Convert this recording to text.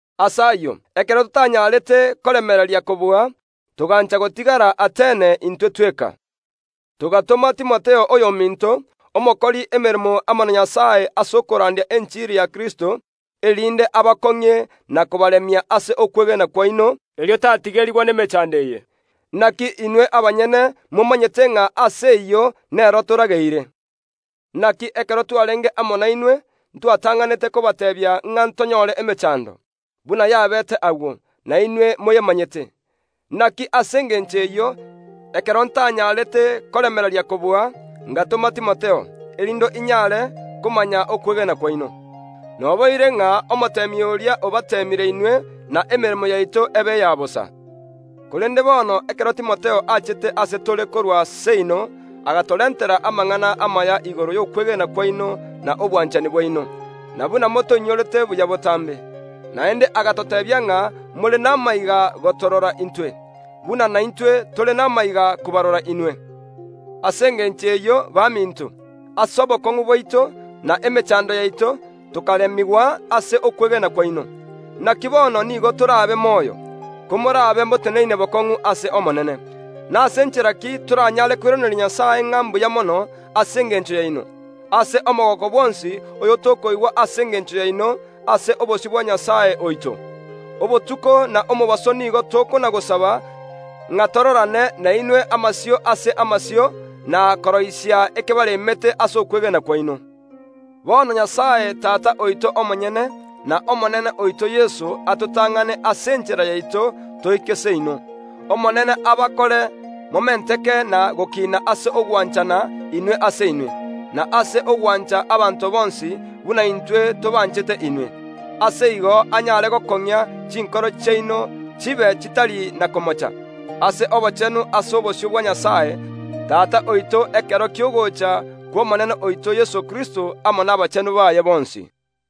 Ase ayio, ekero totanyarete koremereria kobua, togancha gotigara Atene intwe tweka. Togatoma Timotheo oyominto, omokori emeremo amo na Nyasae ase okorandia enchiri ya Kristo, erinde abakong’ie na kobaremia ase okwegena kwaino, erio tatigerigwa nemechando eye. Naki inwe abanyene ’momanyete ng’a ase ayio nero torageire. Naki ekero twarenge amo nainwe ntwatang’anete kobateebia ng’a ntonyore emechando, buna yabeete agwo, na inwe moyemanyete. Naki ase engencho eyio, ekero ntanyarete koremereria kobua, ngatoma Timotheo, erinde inyare komanya okwegena kwaino. Noboire ng’a omoteemi oria obateemire inwe na emeremo yaito ebe eya bosa. Korende bono ekero Timotheo achete ase tore korwa seino agatorentera amang’ana amaya igoro y’okwegena kwaino na obwanchani bwaino, na buna motoinyorete buya botambe. Naende agatoteebia ng’a more namaiga gotorora intwe, buna naintwe tore namaiga kobarora inwe. Ase engencho eyio, baminto, ase obokong’u bwaito, na emechando yaito, tokaremigwa ase okwegena kwaino. Naki bono nigo torabe moyo, komorabe moteneine bokong’u ase Omonene. Nase nchera ki toranyare koiraneria Nyasae ng’a mbuya mono ase engencho yaino, ase omogooko bwonsi oyotokoigwa ase engencho yaino ase obosio bwa Nyasae oito? Obotuko na omobaso nigo tokona‐gosaba ng’a tororane nainwe amasio ase amasio, na koroisia ekebaremete ase okwegena kwaino. Bono Nyasae Tata oito omonyene, n’Omonene oito Yeso atotang’ane ase enchera yaito, toike seino. Omonene abakore momenteke na gokiina ase ogwanchana inwe ase inwe, na ase ogwancha abanto bonsi, buna intwe tobanchete inwe. Ase igo anyare gokong’ia chinkoro chiaino chibe chitari na komocha, ase obochenu ase obosio bwa Nyasae, Tata oito ekero ki’ogocha kw’Omonene oito Yeso Kristo amo nabachenu baaye bonsi.